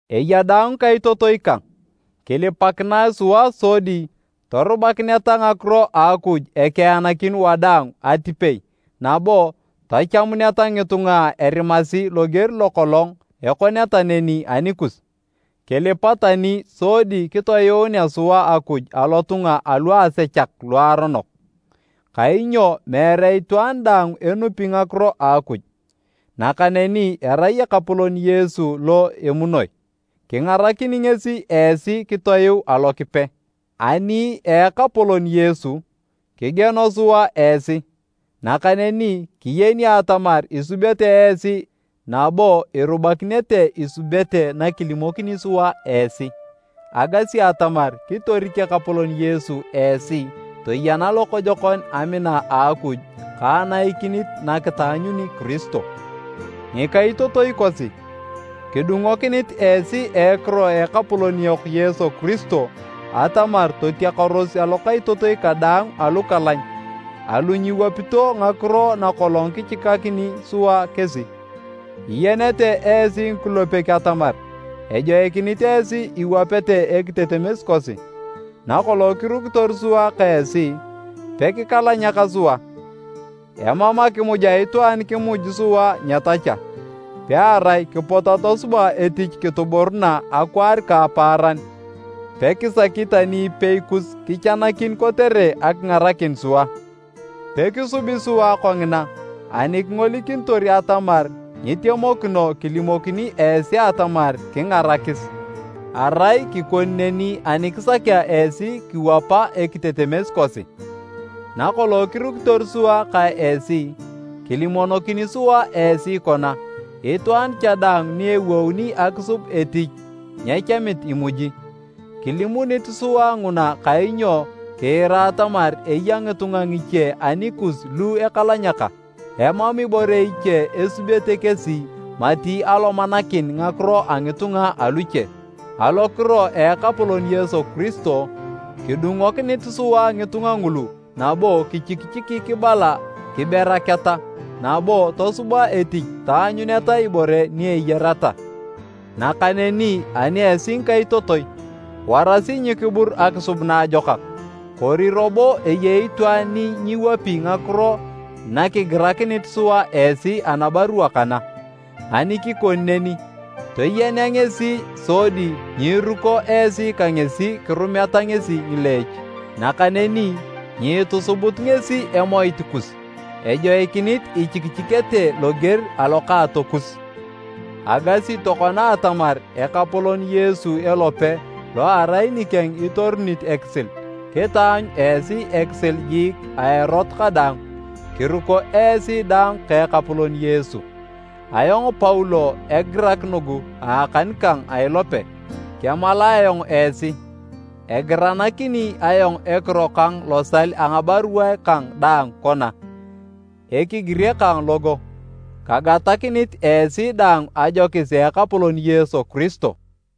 Eya daang ngikaitotoi kang, kilipakinae sua sodi torubakineta ngakiro a Akuj ekeanakin wadaang atipei nabo tachamuneta ngitunga erimasi loger lo kolong ekoneta neni anikus. Kilipa tani sodi kitoyuunea sua Akuj alotunga aluasechak luaronok, kainyo meere itwaan daang enupi ngakiro a Akuj. Nakaneni erai Ekapolon Yesu lo emunoi. Kingarakini ngesi esi kitoyuu Alokipe. Ani a Ekapolon Yesu, kigieno sua esi, nakaneni kiyeni atamar isubete esi nabo irubakinete isubete nakilimokini sua esi. Agasi atamar kitorik Ekapolon Yesu esi toyena lokojokon amina a Akuj ka anaikinit nakitaanyuni Kiristo. Ngikaitotoi kosi, kidungokinit esi a ekiro a Ekapolon yok Yesu Kiristo atamar totiakaros alokaitotoi kadaang alukalany alu nyiwapito ngakiro na kolong kichikakini sua kesi. Iyenete esi ngikulepek atamar ejoikinit esi iwapete ekitetemes kosi. Nakolong kirukitor sua ka esi, pekikalanyaka sua. Emam akimuj a itwaan kimuj sua nyetacha, pearai kipot atosuba etich kituburuna akwaar ka apaaran pekisaki tani ipei kus kichanakin kotere akingarakin sua. Pekisubi sua kongina ani kingolikinitor atamar nyitemokino kilimokini esi atamar kingarakis. Arai kikoni neni ani kisakea esi kiwapa ekitetemes kosi. Nakolong kirukitor sua ka esi, kilimonokini sua esi kona, “Itwaan cha daang ni ewouni akisub etich nyechamit imuji.” Kilimunit sua nguna kainyo kiira atamar eya ngitunga ngiche anikus lu ekalanyaka, emam ibore iche esubete kesi mati alomanakin ngakiro a ngitunga aluche. Alokiro a Ekapolon Yesu Kiristo, kidungokinit sua ngitunga ngulu nabo kichikichiki kibala kiberaketa nabo tosuba etich taanyuneta ibore ni eyareta. Nakaneni ani esi ngikaitotoi, warasi nyikibur akisub naajokak. Kori robo eyei itwaan ni nyiwapi ngakiro nakigirakinit sua esi anabarua kana? Ani kikoni neni, toyena ngesi sodi nyiiruko esi ka ngesi kirumeta ngesi ngileech. Nakaneni nyiitusubut ngesi emoit kus, ejoikinit ichikichikete loger alokaatokus. Agasi tokona atamar Ekapolon Yesu elope lo erai nikeng itorunit ekisil, kitaanyu esi ekisil jiik a erot kadaang, kiruko esi daang ka Ekapolon Yesu. Ayong Paulo egirak nugu a akan kang a ilope. Kemalae ayong esi. Egiranakini ayong ekiro kang losal a ngabaruae kang daang kona, ekigire kang logo. Kagatakinit esi daang ajokis a Ekapolon Yesu Kiristo.